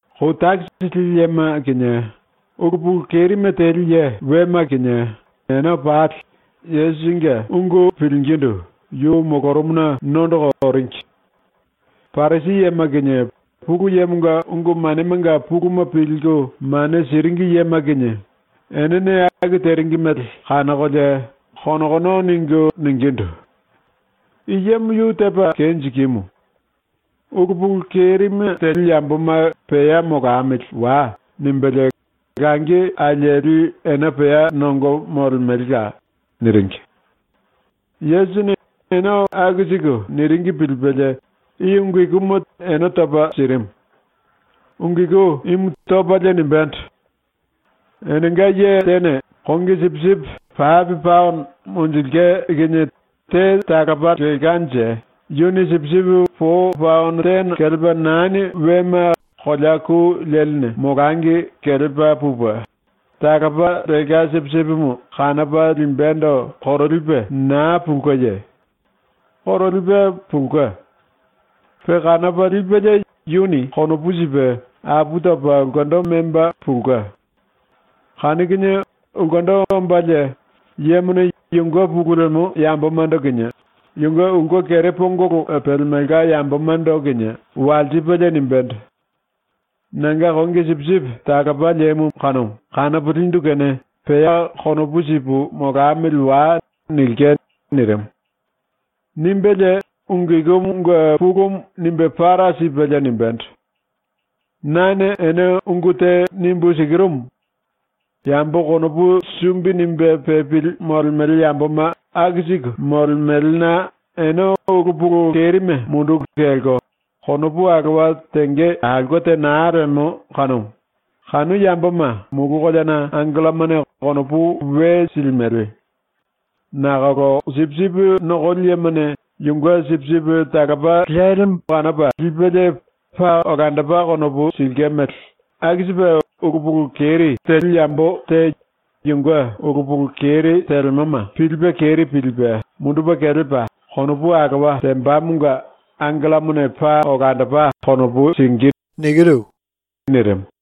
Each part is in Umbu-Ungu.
Kou takisi lili yema kinie ulu pulu kerime teli ye wema kinie ene pali Yesusinge ungu pilingindu yu molorumuna nondoko oringi. Parisi yema kinie Pulu Yemonga ungu manemanga puluma pilku mane siringi yema kinie enene aku teringi mele kanokolie konokono ningu ningindu: “I yemo yu tepa kenjikimu. Ulu pulu kerime ambololi yamboma “Pea molamili wai.” nimbelie, langi alieli ene pea nongo molemelela.” niringi. Yesusini ene aku siku niringi pilipelie ⸤i ungu ikuma ene topa sirimu.⸥ Ungu iku imu topalie nimbendo: “Enenga ye tene kongi sipisipi pape paono monjilke kinie te talopa lelkanje yuni sipisipi po paono tene kelepa nani wema kolea ku leline molangi kelepa pupe, talopa lelka sipisipimu kanopa limbendo korolipe naa pulkeye? ⸤Korolipe pulke.⸥ Pe kanopa lipelie yuni konopu sipe apu topa ulkendo memba pulke. Kanu kinie ulkendo ombalie yemone yunge pulu lemo yambomando kinie yunge ulke kere pongolo pelemelka yambomando kinie walsipelie nimbendo: “Nanga kongi sipisipi talopa lemumu kanopo lindu kene pea konopu sipu molamili wai.” nilke.” ⸤nirimu.⸥ ⸤Nimbelie ungu ikumunge pulumu nimbe para sipelie nimbendo:⸥ “Nane ene ungu te nimbu sikirumu: Yambo konopu sumbi nimbe pepili molemele yamboma aku siku molemelena ene ulu pulu kerime munduku kelko konopu alowa tenge aulke te naa lemo kanumu, kanu yamboma mulu koleana angellomane konopu we silimele. Nakolo sipisipi nokoli yemone yunge sipisipi talopa lelimu kanopa lipelie paa olandopa konopu silke mele aku sipe ulu pulu keri ambololi yambo te yunge ulu pulu keri telemoma pilipe keri pilipe mundupe kelepa konopu alowa tembamonga angellomane paa olandopa konopu singí.” ⸤nirimu.⸥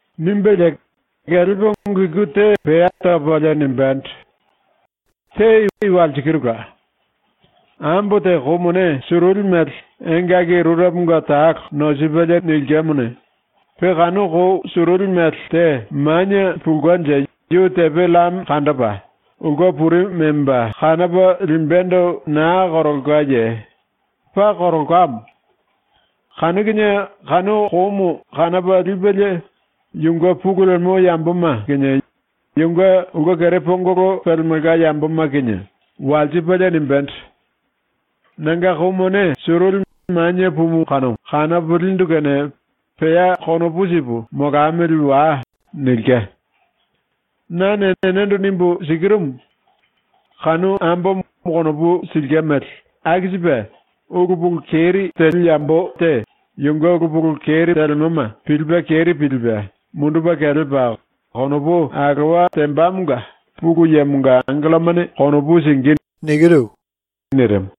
⸤Nimbelie kelepa ungu iku te pea topalie nimbendo:⸥ “Te i walsikirula: Ambo te kou mone suruli mele engaki rureponga talo nosipelie nilkemone, pe kanu kou suruli mele te manie pulkenje yu tepe llame kandopa ulke puri memba kanopa limbendo naa korolkaye? ⸤Paa korolkamo.⸥ Kanu kinie kanu koumu kanopa lipelie yunge pulu lemo yamboma kinie yunge ulke kere pongolo pelemelka yamboma kinie walsipelie nimbendo: “Nanga kou mone suruli manie pumumu kanopo lindu kene pea konopu sipu molamili wai.” nilke. “Nane ene nimbu sikirumu: Kanu ambomo konopu silke mele aku sipe ulu pulu keri ambololi yambo te yunge ulu pulu keri telemoma pilipe keri pilipe mundupe kelepa konopu alowa tembamonga Pulu Yemonga angellomane konopu singí.” nirimu.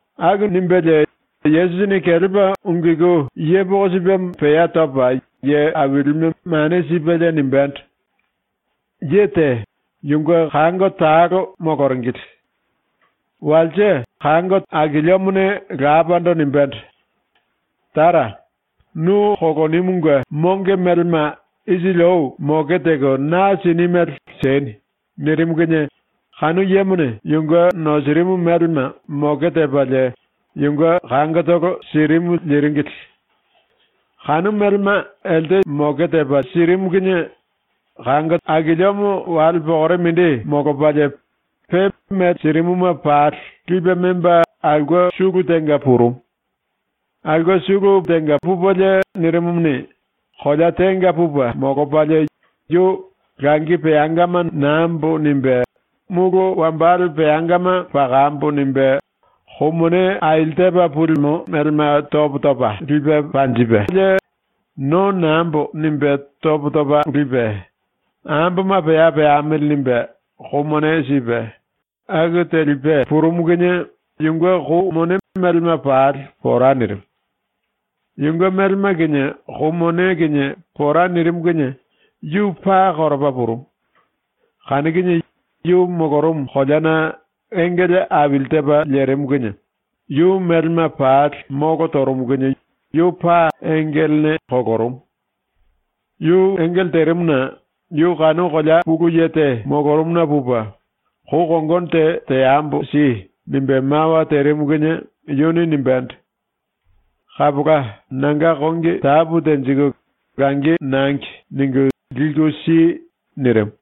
⸤Aku nimbelie⸥ Yesusini kelepa ⸤ungu iku yepoko sipemo pea topa ye ailime mane sipelie⸥ nimbendo: “Ye te, yunge kango talo moloringili. Walse akiliomone lapando nimbendo: “Tara, nu kolonimunge monge melema isili ou moke teko na sini mele sieni.” nirimu kinie kanu yemone yunge nosirimu melema moke tepalie yunge kangotolo sirimu liringili. Kanu melema elte sirimu kinie akiliomo wale pokore mindi molopalie, pe mele sirimuma pali lipe memba aulke sulu tenga purumu. Aulke sulu pupelie nirimumuni, kolea tenga pupe molopalie yu ‘Langi peangama nambo.’ nimbe, ‘Mulu wambale peangama pakambo.’ nimbe kou mone aili tepa pulimo melema topo topa lipe panjipelie, ‘No nambo.’ nimbe topo topa lipe, ‘Amboma pea peamili.’ nimbe kou mone sipe, aku telipe purumu kinie yunge kou mone melema pali pora nirimu. Yunge melema kinie kou mone kinie pora nirimu kinie yu paa koropa purumu. Kanu kinie yu molorumu koleana engele aili tepa lerimu kinie yu melema pali molo torumu kinie yu paa engelene kolorumu. Yu engele terimuna yu kanu kolea pulu ye te molorumuna pupe “Kou kongono te teambo si.” nimbe mawa terimu kinie yuni nimbendo: “Kapola, nanga kongi tapu tenjiku langi nurupuluma ‘Nangi.’ ningu liku si.” nirimu.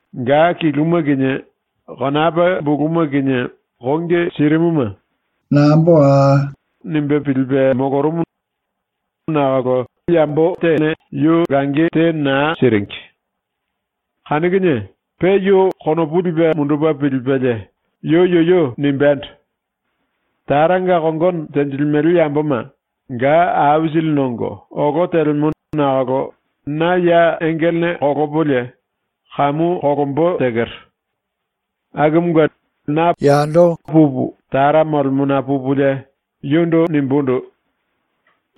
Ga kiluma kinie konapa buluma kinie kongi sirimuma ‘Nambo.’ nimbe pilipe molorumu nakolo yu te naa siringi. Kanu kinie pe yu konopu lipe mundupe pilipelie yu yuyu nimbendo: ‘Taranga kongono tenjilimele yamboma ga aisili nongo olo telemo nakolo na ya engelene kolopolie kamu kolombo tekero. Akumunge na pupu Tara molemona pupulie yundu nimbundu: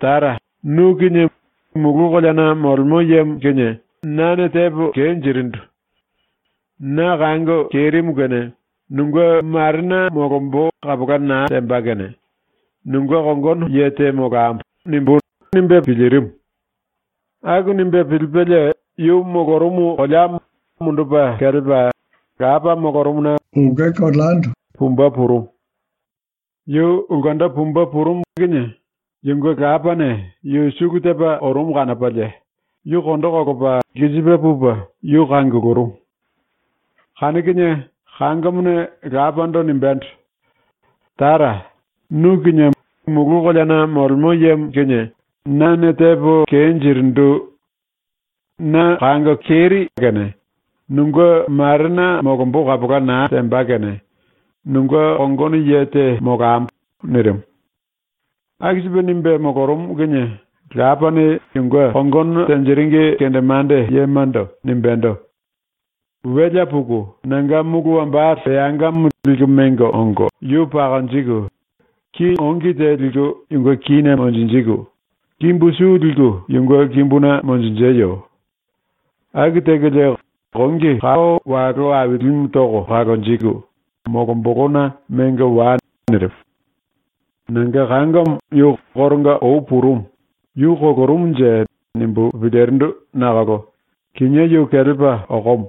“Tara, nu kinie Mulu Koleana Molemo Yemo kinie nane tepo kenjirindu. Na kango kerimu kene nunge marena molombo kapola naa temba kene nunge kongono ye te molambo.” nimbú.’ nimbe pilirimu. Aku nimbe pilipelie yu molorumu koleamo mundupe kelepa, lapa molorumuna pumbe purumu. Yu ulkendo pumbe purumu kanu kinie yunge lapane yu sulu tepa orumu kanopalie yu kondo kolopa lkisipe pupe yu kangulurumu. Kanu kinie kangomone lapando nimbendo: “Tara, nu kinie Mulu Koleana Molemo Yemo kinie nane tepo kenjirindu. Na kango kerimu kene nunge marena molombo kapola naa temba kene nunge kongono ye te molambo.” nirimu. Aku sipe nimbe molorumu kinie lapane yunge kongono tenjiringi kendemande yemando nimbendo: “Welea puku nanga mulu wambale peangamo liku mengo ongo yu pakonjiku, ki ongi te liku yunge kíne monjinjiku, kimbu su liku yunge kimbuna monjinjeyo. Aku tekolie kongi kao walo ailimu toko kalonjiku molombolona mengo wai.” nirimu. “Nanga kangomo yu koronga ou purumu, ‘Yu kolorumunje.’ nimbu pilirindu nakolo kinié yu kelepa okomo.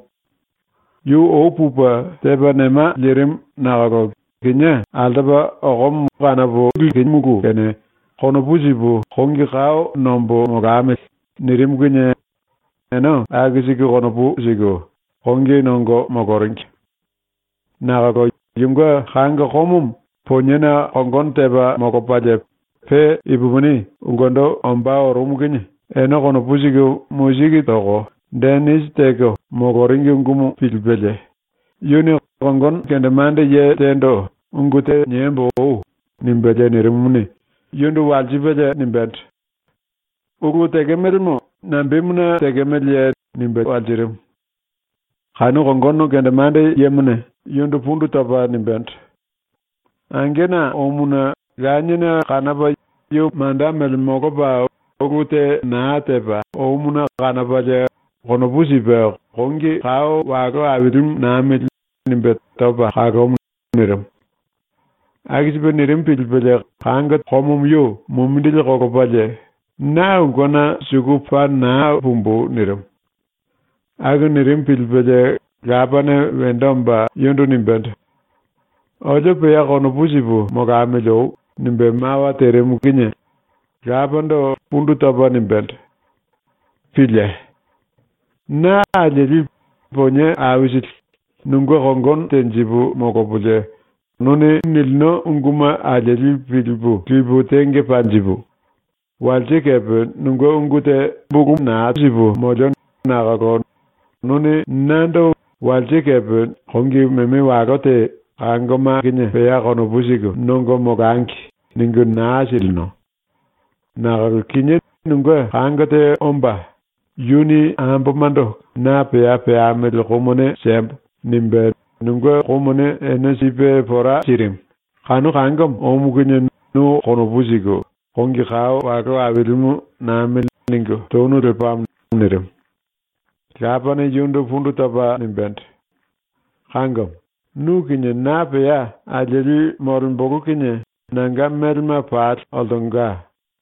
Yu ou pupe tepa nema lirimu nakolo kinié altopa okomo kanopo likimulu kene konopu sipu kongi kao nombo molamili.” nirimu kinie ene aku siku konopu siku kongi nongo moloringi. Nakolo yunge kango komomo poniena kongono tepa molopalie pe ipupini ulkendo ombá orumu kinie ene konopu siku musiki toko denisi teko moloringi ungumu pilipelie yuni kongono kendemande ye tendo “Ungu te niembo oi.” nimbelie nirimumuni, yundu walsipelie nimbendo: “Ulu tekemelemo nambemuna tekemeleye?” nimbe walsirimu. Kanu kongono kendemande yemone yundu pundu topa nimbendo: “Angena omuna laniene kanopa yu manda mele molopa ulu te naa tepa omuna kanopalie konopu sipe “Kongi kao walo ailimu namili.” nimbe topa kalomu.” nirimu. Aku sipe nirimu pilipelie komomo yu mumindili kolopalie “Na ulkena suku paa naa pumbu!” nirimu. Aku nirimu pilipelie lapane wendo omba yundu nimbendo: “Olio pea konopu sipu molamili oi.” nimbe mawa terimu kanu kinie lapando pundu topa nimbendo: “Pílie! Na alieli, ponie aisili, nunge kongono tenjipu molopolie nu nilino unguma alieli pilipu lipu tenge panjipu, walse kepe nunge ungu te karaye naa tepo molio nakolo nuni nando walse kepe kongi meme walo te ‘Kangoma kinie pea konopu siku nongo molangi.’ ningu naa silino. Nakolo kinié nunge kango te omba, yuni ambomando “Na pea peambili kou mone siembo.” nimbe nunge kou mone ene sipe pora sirimu, kanu kangomo omu kinie nu konopu siku ‘Kongi kao walo ailimu namili.’ ningu tonu lepamo.” nirimu. Lapane yundu pundu topa nimbendo: “Kangomo, nu kinie na pea alieli molembolo kinie nanga melema pali oltonga.